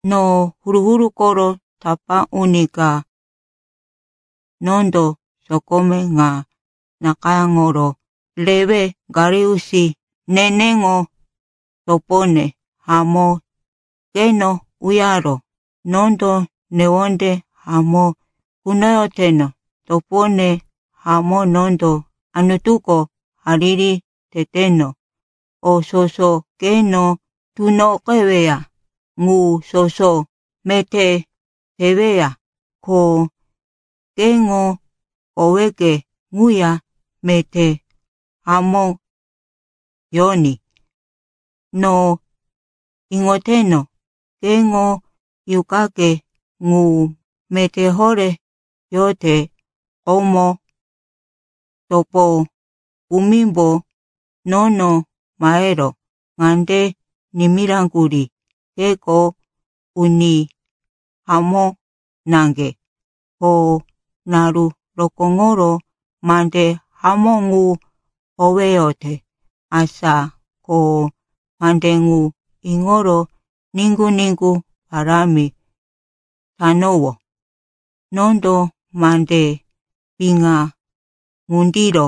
No huru-huru koro tapá uni ka, nondo sokome ŋa nakayáŋoro rewe Gaius, neneŋo topone hamó, keno uyaró. Nondo newonde hamó kunoyoteno. Topone hamó, nondo Anutuko hariri teteno, o soso keno tunoqeweya ŋu soso meté teweya, ko keŋo koweke ŋuya meté hamó yoní. No iŋoteno, keŋo yuqake ŋu meté horé yote. Komo topo kumimbo nono mahero ŋande nimiraŋgurí, keko uni hamó naŋge ko naru rokóŋoro mande hamó ŋu howeyote. Asa ko mande ŋu iŋoro niŋgu-niŋgu parámi tanowó. Nondo mande piŋa ŋundiro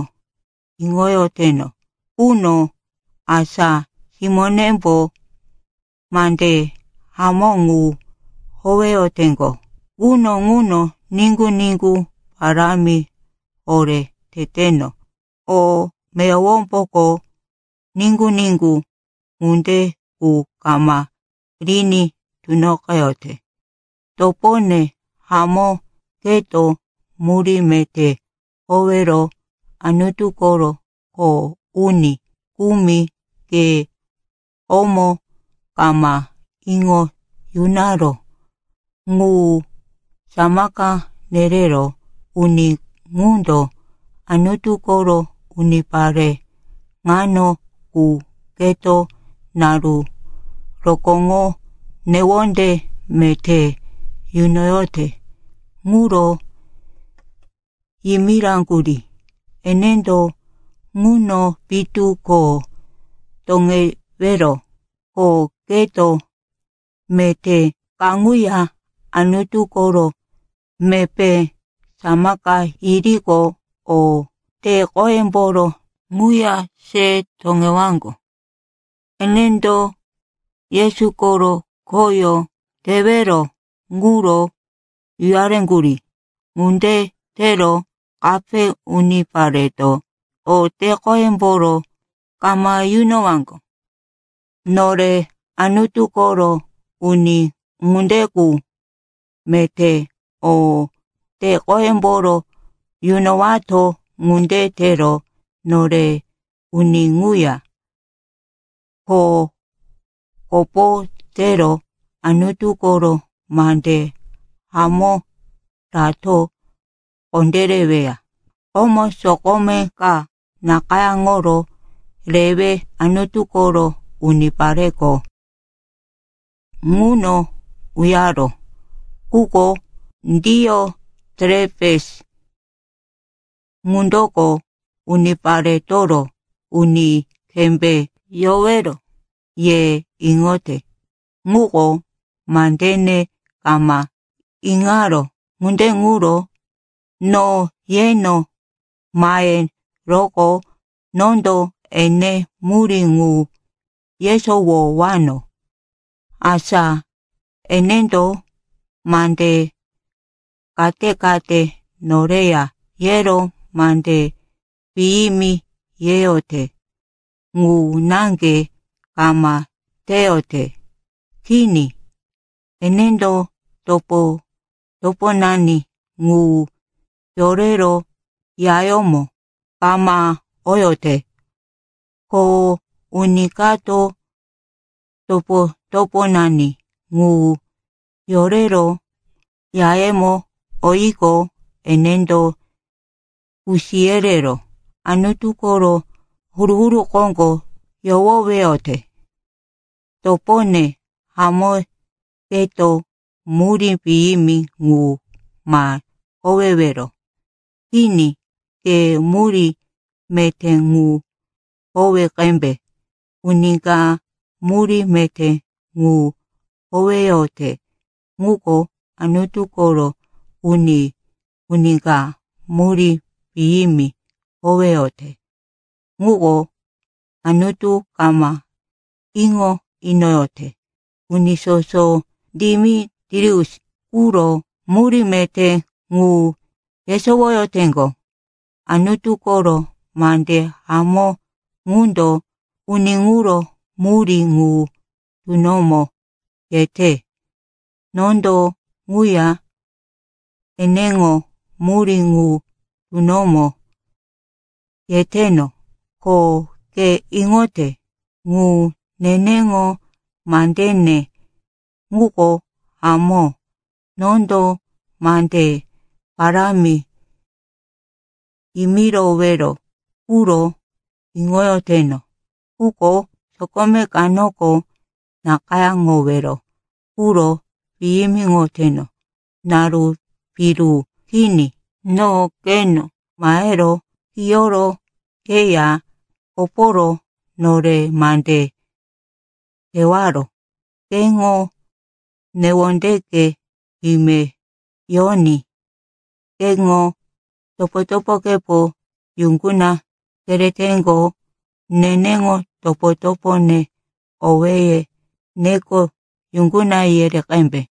iŋoyoteno quno, asa simónembo mande hamó ŋu howeyoteŋgo, quno ŋuno niŋgu-niŋgu parámi horé teteno. O meyowomboko niŋgu-niŋgu ŋunde qu kama riní tunoqeyote. Topone hamó, keto murí meté howero Anutu koro kho uni kumi ke komo kama iŋo yunaró ŋu samaka yereró. Uni ŋundo Anutu koro unipare ŋano qu keto naru rokóŋo newonde meté yunoyote ŋuro yimiraŋgurí. Enendo ŋuno pitu ko toŋewero, ko keto meté kaŋuya Anutu koro mepé samaka yiriqo, o te-qoyemboro ŋuya se toŋewaŋgo. Enendo Yesu koro khoyó tewero ŋuro uyareŋgurí. Ŋunde tero kape unipareto o te-qoyemboro kama yunowaŋgo. Nore Anutu koro uni ŋunde qu meté o te-qoyemboro yunowato. Ŋunde tero nore uni ŋuya kho kopo tero Anutu koro mande hamó rato kondéreweya. Komo sokome ka nakayáŋoro rewe Anutu koro unipareko ŋuno uyaró. Quko Dioterepes ŋundoko uniparetoro uni kembé yowero ye iŋote, ŋuko mandene kama iŋaró. Ŋunde ŋuro no yeno maheroqo, nondo ene murí ŋu yesowowano, asa enendo mande kate-kate noreya yero mande piyimi yeyote. Ŋu naŋge kama teyote. Kini. Enendo topo-toponani ŋu yorero yayómo kama oyote. Ko uni kato topo-toponani ŋu yorero yayemo oyiqo, enendo kusi yerero Anutu koro huru-huru koŋgo yohoweyote. Topone hamó, keto murí piyimi ŋu ma howewero. Kini, ke murí meté ŋu howe qembe. Uni ka murí meté ŋu howeyote, ŋuko Anutu koro uni. Uni ka murí piyimi howeyote, ŋuko Anutu kama iŋo inoyote. Uni soso Demitrius ŋuro murí meté ŋu yesowoyoteŋgo. Anutu koro mande hamó ŋundo uni ŋuro murí ŋu tunomo yete. Nondo ŋuya eneŋo murí ŋu tunomo yeteno, ko ke iŋote ŋu, neneŋo mandene ŋuko hamó. Nondo mande parámi yimirowero quro iŋoyoteno. Quko sokome kanoko nakayáŋowero ŋuro piyimiŋoteno. Naru piru kini no keno mahero kiyoro keya koporo nore mande tewaro. Keŋo newondeke ime yoní. Keŋo topo-topokepo yuŋguna kereteŋgo. Neneŋo topo-topone owéye neko yuŋguna yere qembe.